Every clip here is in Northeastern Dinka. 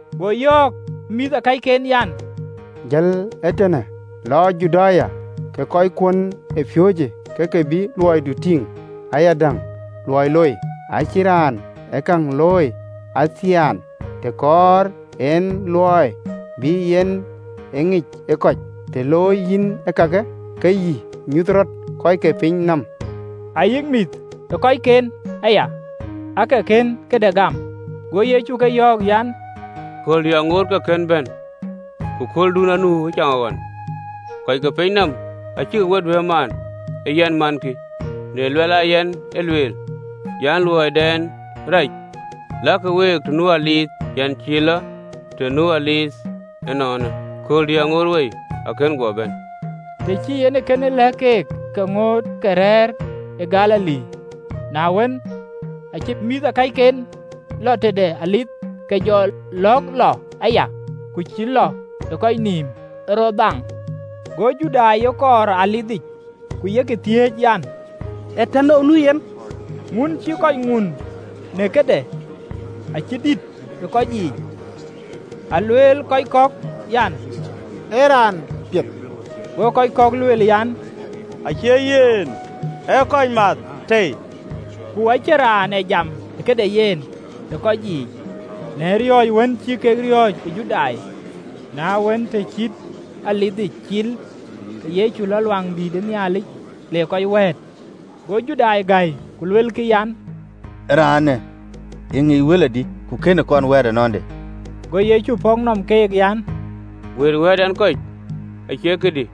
Go yɔ̈ɔ̈k ë mïthëkɔcken an, “Jël ee tënë, lɔ Juda, ke kɔckuön ë piööcë ke ke bï luɔidu tïŋ ayadäŋ luɔi loi. Acïn raan ë käŋ looi athiɛɛn, të kɔɔr en luɔi bï ye ŋic ë kɔc. Të looi yïn ee kakë, ke yï nyuth rɔt kɔc ke piny nɔm!” (Ayï mïthëkɔcken aya aake kën këde gam.) Go Yecu keek yɔ̈ɔ̈k an, “Kööldï aŋoot ke kën bɛ̈n, ku kööldun ee nu ëcaŋɣɔn. Kɔc ke piny nɔm acïkï we duëër maan, ee yɛn mankï, në luɛl aa yɛn ë lueel an, luɔiden arac. Lakï week të nu dhuëëŋë: yɛn cïï lɔ të nu dhuëëŋ ënɔɔnë, kööldï aŋoot wei, akën guɔ bɛ̈n.” Të cï en ee kënë lɛ̈k keek, ke ŋoot ke rɛ̈ɛ̈r ë Galili. Na wën, aacï mïthëkɔcken lɔ tëde dhuëëŋ, ke jɔ lɔ̈ɔ̈k lɔ aya, ku cïï lɔ ë kɔc nïïm, ë rɔ dhaaŋ. Go Judai ye kɔɔr ë dhuëëŋic, ku yek thiëëc an, “Ee tënou nu yen?” Ŋun cïï kɔc ŋun në këde acï dït ë kɔc yiic: alueel kɔc kɔ̈k an, “Ee raan piɛth, go kɔc kɔ̈k lueel an, Acie yen, ee kɔc math tei.” Ku acïn raan ee jam ë këde yen ë kɔc yiic, në riɔ̈ɔ̈c wën cï kek riɔ̈ɔ̈c ë Judai. Na wën, të cït dhuëëŋic cil, ke Yecu lɔ ë Luaŋdïtic, le kɔc wɛ̈ɛ̈t. Go Judai gäi, ku luelkï an, “Raanë ëŋic wël adï, ku kënë kɔn wɛ̈ɛ̈t anande?” Go Yecu pɔ̈k nɔm keek an, “Wëët wɛ̈ɛ̈t ɛn kɔc acie këdï,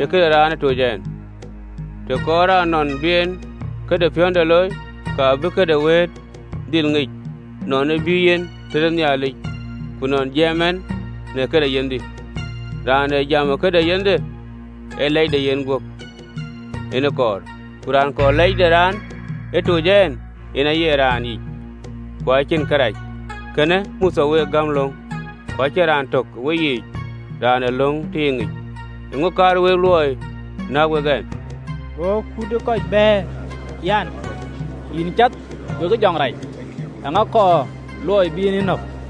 ee këde raan ë toc ɛn. Të kɔɔrë raan nɔn bï en këde piɔ̈nde looi, ka bï këdiën wɛ̈ɛ̈t dhil ŋic, nɔn ë bï yen tëde Nhialic, ku nɔn jaam ɛn në këde yenhdï. Raan ë jam ëkëde yenhde ee lɛc de yenguöp en kɔɔr: ku raan kɔɔr lɛc de raan ë toc en, yen aye raan yic, ku cïnic kërac. Kën Mothe we gäm löŋ, ku acïn raan tök ë weyiic raan ë löŋ tiiŋic? Eeŋö kaar wek luɔi näk wek ɛn?” Go kut ë kɔc bɛ̈ɛ̈r, an, “Yïn cath we jɔŋ rac! Eeŋa kɔɔr luɔi bï en yï nɔ̈k?”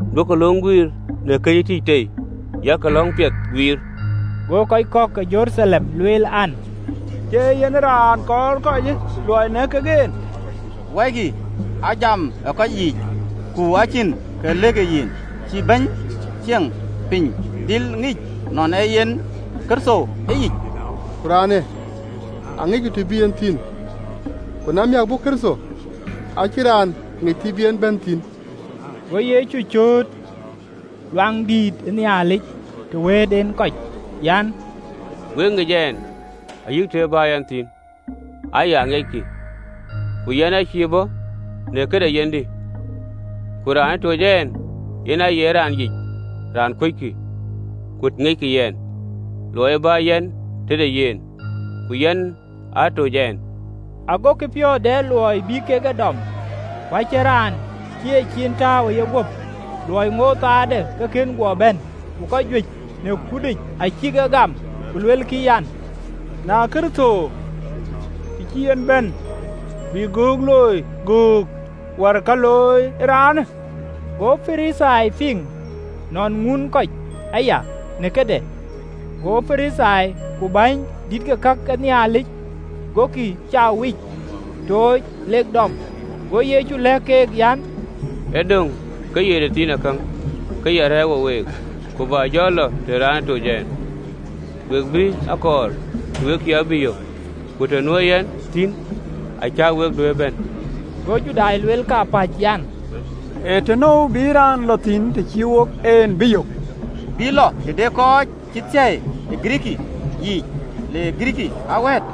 Duökï löŋ ë guiir në kë cï tïc tei, yak löŋ piɛth guiir.” Go kɔc kɔ̈k ke Jeruthalem lueel an, “Cie yen raan kɔɔr kɔc luɔi nɛ̈k kek en? Wɔikï! Ajam ë kɔc yiic, ku acïn kë lëkkï yen. Cï bäny ceŋ piny dhil ŋic nɔn ee yen Kërtho ëyic? Ku raanë aŋicku të bï yen thïn: ku na miäk bɔ̈ Kërtho, acïn raan ŋic të bï en bɛ̈n thïn.” Go Yecu cööt ë Luaŋdïtic, të wën wëët en kɔc an, “Wek ŋic ɛn ayï të ë bä yɛn thïn aya aŋiɛckï, ku yɛn aacïï bɔ̈ në këde yenhdï, ku raan ë toc ɛn, yen aye raan yic, raan kuöckï. Ku aŋiɛc yɛn, luɔi e bä yɛn tëde yen, ku yen aa toc ɛn.” Agokï piɔ̈ɔ̈th dɛ luɔi bï kek e dɔm: ku acïn raan cï yeciin tääu ë yeguöp, luɔi ŋootë köölde ke kën guɔ bɛ̈n. Ku kɔc juëc në kutic acïk e gam, ku luelkï an, “Kërtho, të cï yen bɛ̈n, bï göök looi göök wär ka looi ee raanë?” Go Parithai piŋ nɔn ŋuunë kɔc aya në këde, go Parithai ku bäny dït ke kakë Nhialic gokï bäny ee kɔc mac tooc, lek dɔm. Go Yecu lɛ̈k keek, an, “Ë döŋ ke ye tëthiinakäŋ ke ya rɛ̈ɛ̈r wo week, ku bä jɔ lɔ tëde raan ë toc ɛn. We bï a kɔɔr, ku we cïï a bï yök, ku të nuö yɛn thïn, acä wek duëër bɛ̈n.” Go Judai lueel kapäc, an, “Ee tënou bï raanë lɔ thïn, të cïï wok en bï yök? Bï lɔ tëde kɔc cï thiëi ë Girikii yiic, le Girikii aa wɛ̈ɛ̈t?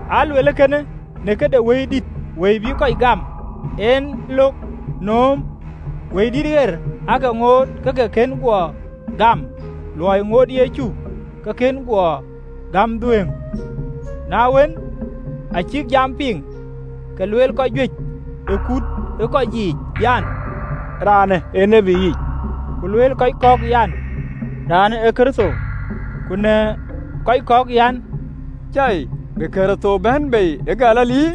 Aa luel ee kënë në këde Wëidït, Wëi bïï kɔc gam en lɔ̈ɔ̈k nööm, Wëidït aake ŋoot ke ke kënë guɔ gam, luɔi ŋootë Yecu ke kënë guɔ gäm dhuëëŋ. Na wën, acïk jamë piŋ, ke luel kɔc juëc ë kut ë kɔc yiic an, “Raanë ee tiët ë yic!” Ku lueel kɔc kɔ̈k an, “Raanë ee Kërtho!” Ku në kɔc kɔ̈k an, “Cai! Bï Kërtho bɛ̈n bei ë Galili!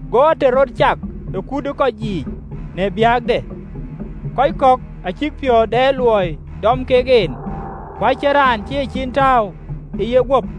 Go ater rɔt cak ë kut ë kɔc yiic në biäkde. Kɔc acïk piɔ̈ɔ̈th de luɔi dɔm kek en, ku acïn raan cï e ciin tääu ë yeguöp.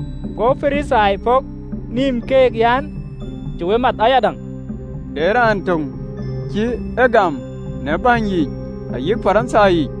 Go Parithai pɔ̈k nïïm keek an, “Cï we math ayadäŋ? De raan töŋ cï ye gam në bäny yiic ayï Parithai yiic?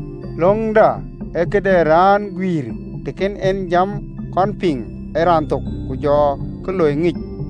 “Löŋda acïï këde raan ee guiir, të kën en jam kɔn piŋ ë raan thok, ku jɔ kë looi ŋic?”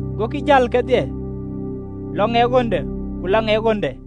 Gokï jäl kedhie, lɔ ŋɛk ɣönde, ku lɔ ŋɛk ɣönde.